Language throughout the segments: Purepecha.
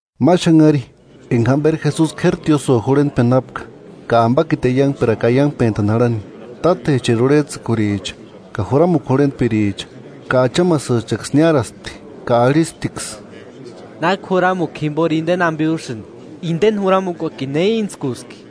Ma xanhari, enga jamberi Jesusi k'éri tiósïo jurhentpeni jápka ka ambakiti aiangperakua aiangpentani jarhani; tátecheri urhejtsïkuricha ka juramukua jurhentpiricha ka achamasïchaksï niáraspti, ka arhisptiksï: –¿Náki juramukua jimbori indeni ambe úsïni? ¿Indeni juramukuakini ne íntskuski?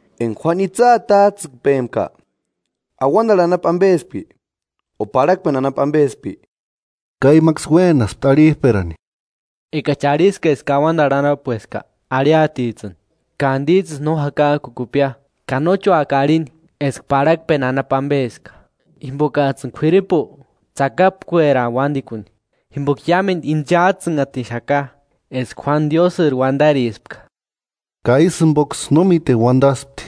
Enga Juánu itsï atajtsïkpempka ¿Auandarhu anapu ambespki, o parhakpeni anapu ambespki? Ka imaksï uénaspti arhijperani: “Engachi arhiska eska auandarhu anapueska, arhiatijtsïni: ‘¿Ka andisïjtsïsï no jakajkukupkia?’ Ka nóchi úaka arhini eska parhakpeni anapu ambeska, jimbokajtsïni k'uiripu tsakapkueraaka uándikuni, jimboka iámendu inchajtsïnhatixaka eska Juánu Diósïri uandarispka.” Ka ísï jimboksï no míteni uandaspti.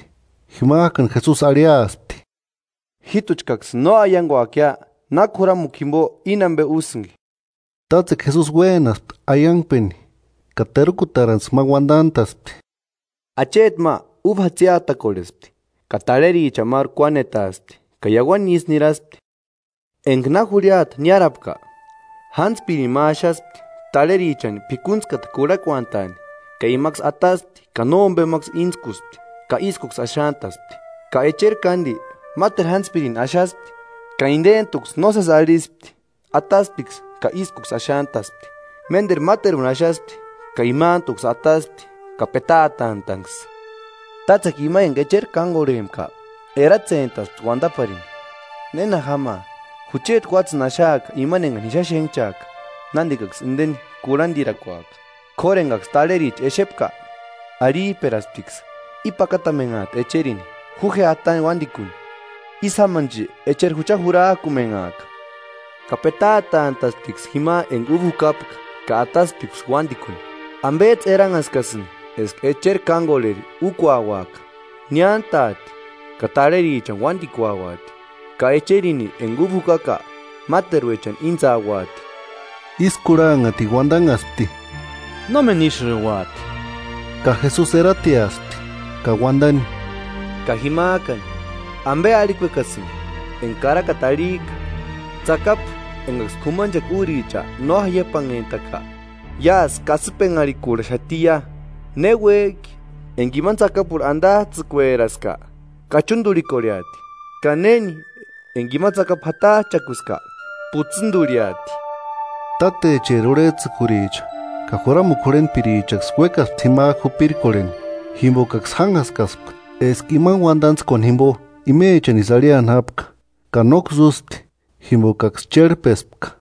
Jimajkani Jesusi arhiaspti: –Jíjtuchkaksïni no aianguakia náki juramukua jimbo íni ambe úsïnki. Tátsekua Jesusi uénaspti aiangpeni ka terukutarantskua ma uandantaspti: –“Acheti ma uba jatsiatakorhespti, ka tarherichani máru kuanetaaspti ka iauani isï niraspti. Enga na jurhiata niárapka, jántspirini ma axaspti tarherichani p'ikuntskata kurhakuantani; ka imaksï ataspti ka nómbemaksï íntskuspti ka ískuksï axantaspti. Ka echeri kándi máteru jántspirini axaspti, ka indentuksï nósesi arhispti, atasptiksï ka ískuksï axantaspti. Ménderu máteruni axaspti, ka imantuksï ataspti ka petaatantaanksï.” “Tátsekua ima enga echeri kángorhempka eratsentaspti uandaparini: ‘¿Néna jámaa? Jucheti uátsïni axaaka imani engani ji xáni xénhchajka; nándikaksï indeni kurhandirakuaka.’ K'óru engaksï tarhericha exepka, arhijperasptiksï: ‘I pakatamenhaati echerini; ju je atani uándikuni, ísï jámanchi echeri jucha jurajkumenhaaka’ Ka petaatantasptiksï jima enga uba jukapka ka atasptiksï uándikuni.” “¿Ambejtsï eranhaskasïnki eska echeri kángorheri úkuauaka? Niántaati ka tarherichani uándikuauati, ka echerini enga uba jukajka máteruechani íntsauati.” Ísï kurhanhatini uandanhaspti: –¡Nómeni ísïuati! Ka Jesusi erateaspti ka uandani: –Ka jimajkani ¿Ambe arhikuekasïnki? Enga karakata arhijka: Tsakapu engaksï k'umanchekua úricha no jaiapanhentaka iásï kasïpenharhikurhaxatiia. Ne uéjki, enga imani tsakapurhu andajtsïkueraska, kachundurhikorheati; ka néni enga ima tsakapu jatajchakuska, putsïndurhiati. Tátecheri urhejtsïkuricha ka juramukua jurhentpirichaksï uékaspti jimajku jupirkorheni, jimbokaksï jánhaskaspka eska imani uandantskuani jimbo imechanisï arhiani jápka, ka nóksï úspti, jimbokaksï chérhpespka.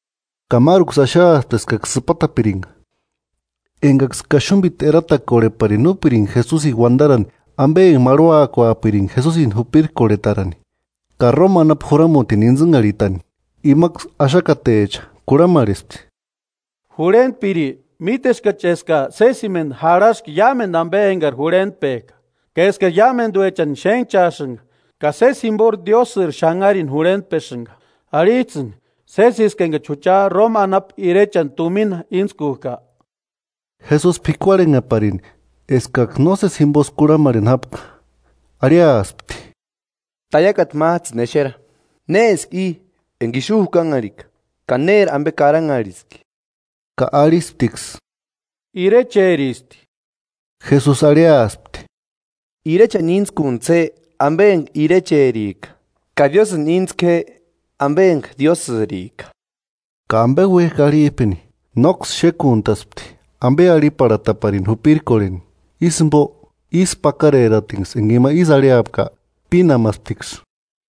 Ka máruksï axaaspti eskaksï sïpatapiringa, engaksï kaxumbiti eratakorheparini úpiringa Jesusini uandarani ambe ma enga marhuakuapiringa Jesusini jupirkorhetarani ka Roma anapu juramutini íntsïnharhitani. Imaksï axakatecha kurhamarhespti: –Jurhentpiri, míteskachi eska sésimendu jarhaska iámendu ambe engari jurhentpejka, ka eskari iámenduechani xénhchaasïnga ka sési jimbori Diósïri xanharini jurhentpesïnga. Arhijtsïni, ¿Sésiski engani jucha Roma anapu irechani tumina íntskujka? Jesusi p'ikuarhenheparini eskaksï nósesi jimbosï kurhamarheni jápka, arhiaspti: 24–Taiakata májtsïni exera. ¿Néski i enga ixu jukanharhika ka néri ambe karanharhiski? Ka arhisptiksï: –Irecheristi. Jesusi arhiaspti: –Irechani íntskuntsï je, ambe enga irecherika; ka Diósïni íntsku je, ambe enga Diósïrika. Ka ambe uéjki arhijpeni, nóksï xékuntaspti ambe arhiparhatapirini jupirkorheni, ísï jimbo ísku pakareratinksï enga ima isï arhiapka, pínamasptiksï.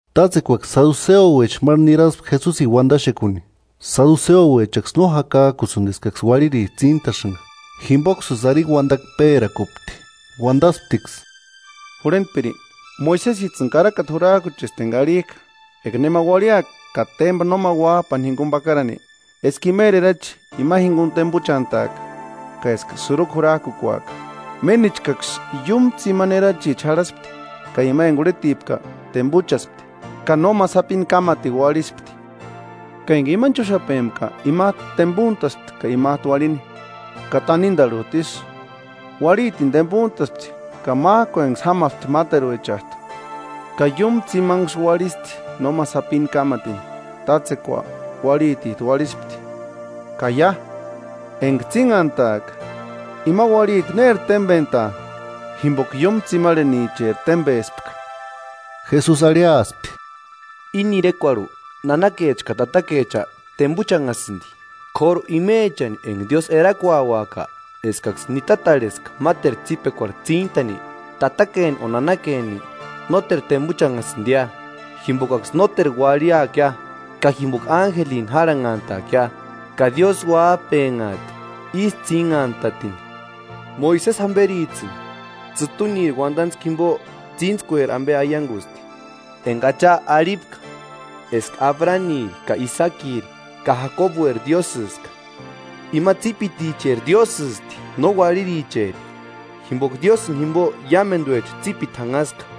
Tátsekuaksï saduseouecha máru niraspti Jesusini uandaxekuni. Saduseouechaksï no jakajkusïndi eskaksï uarhiricha tsíntasïnga; jimboksïsï arini uandakua pérakupti, uandasptiksï: –Jurhentpiri, Moisesijtsïni karakata jurajkuchesti enga arhijka: Eka nema uarhiaka ka témba nóma uájpa jinguni pakarani, eska imeri erachi ima jinguni tembuchantaaka, ka eska sïrukua jurajkukuaka. Ménichkaksï iúmu tsimani erachicha jarhaspti, ka ima enga urhetipka, tembuchaspti, ka no ma sapini kámatini uarhispti. Ka enga imani chúxapempka imajtu tembuntaspti ka imajtu uarhini, ka tanindarhujtu isï, uarhitini tembuntaspti ka májkuenksï jámasti máteruechajtu, ka iúmu tsimanksï uarhisti nóma sapini kámatini. Tátsekua uarhitijtu uarhispti. Ka ia, enga tsínhantaaka ¿Ima uarhiti néri témbentaa, jimboka iúmu tsimarhenicheri témbespka? Jesusi arhiaspti: –Íni irekuarhu, nanakecha ka tatakecha tembuchanhasïndi; k'óru imechani enga Diósï erakuauaka eskaksï nitatarheska máteru tsípekuarhu tsíntani, tatakeni o nanakeni nóteru tembuchanhasïndia, jimbokaksï nóteru uarhiakia, ka jimboka ánjelini járhanhantaakia, ka Diósï uájpenhaati ísï tsínhantatini. Moisesi jamberijtsïni tsïtuniri uandantskua jimbo tsíntskueri ambe aiangusti. Enga Acha arhipka eska Abraniri ka Isaakiri ka Jakobueri Diósïska. ¡Ima tsípiticheri Diósïsti, no uarhiricheri, jimboka Diósïni jimbo iámenduecha tsípiti janhaska!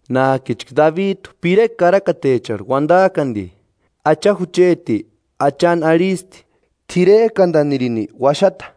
Nájkichka Dabijtu pirekua karakatecharhu uandajki andi: Acha jucheti Achani arhisti: T'irerkandanirini uaxata,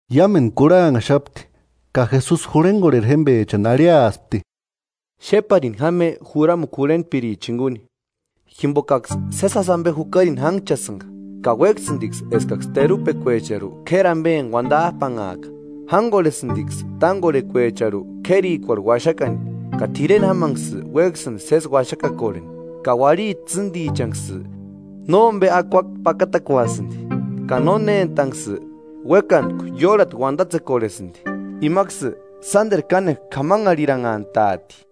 Iámendu kurhanhaxapti ka Jesusi jurhengorheri jémbechani arhiaspti: “Xéparini jáma je juramukua jurhentpirichani jinguni, jimbokaksï sési jásï ambe jukarini jánhchasïnga, ka uéksïndiksï eskaksï terupekuecharhu k'éri ambeni uandajpanhaaka, jángorhesïndiksï tángorhentskuecharhu k'érikuarhu uaxakani ka t'ireni jámanksï uéksïndi sési uaxakakorheni; ka uarhiti tsîndichanksï nómbe akua pakatakuasïndi, ka nónentanksï uékantku iórhati uandatsekorhesïndi. Imaksï sánderu kánekua k'amaharhiranhantaati.”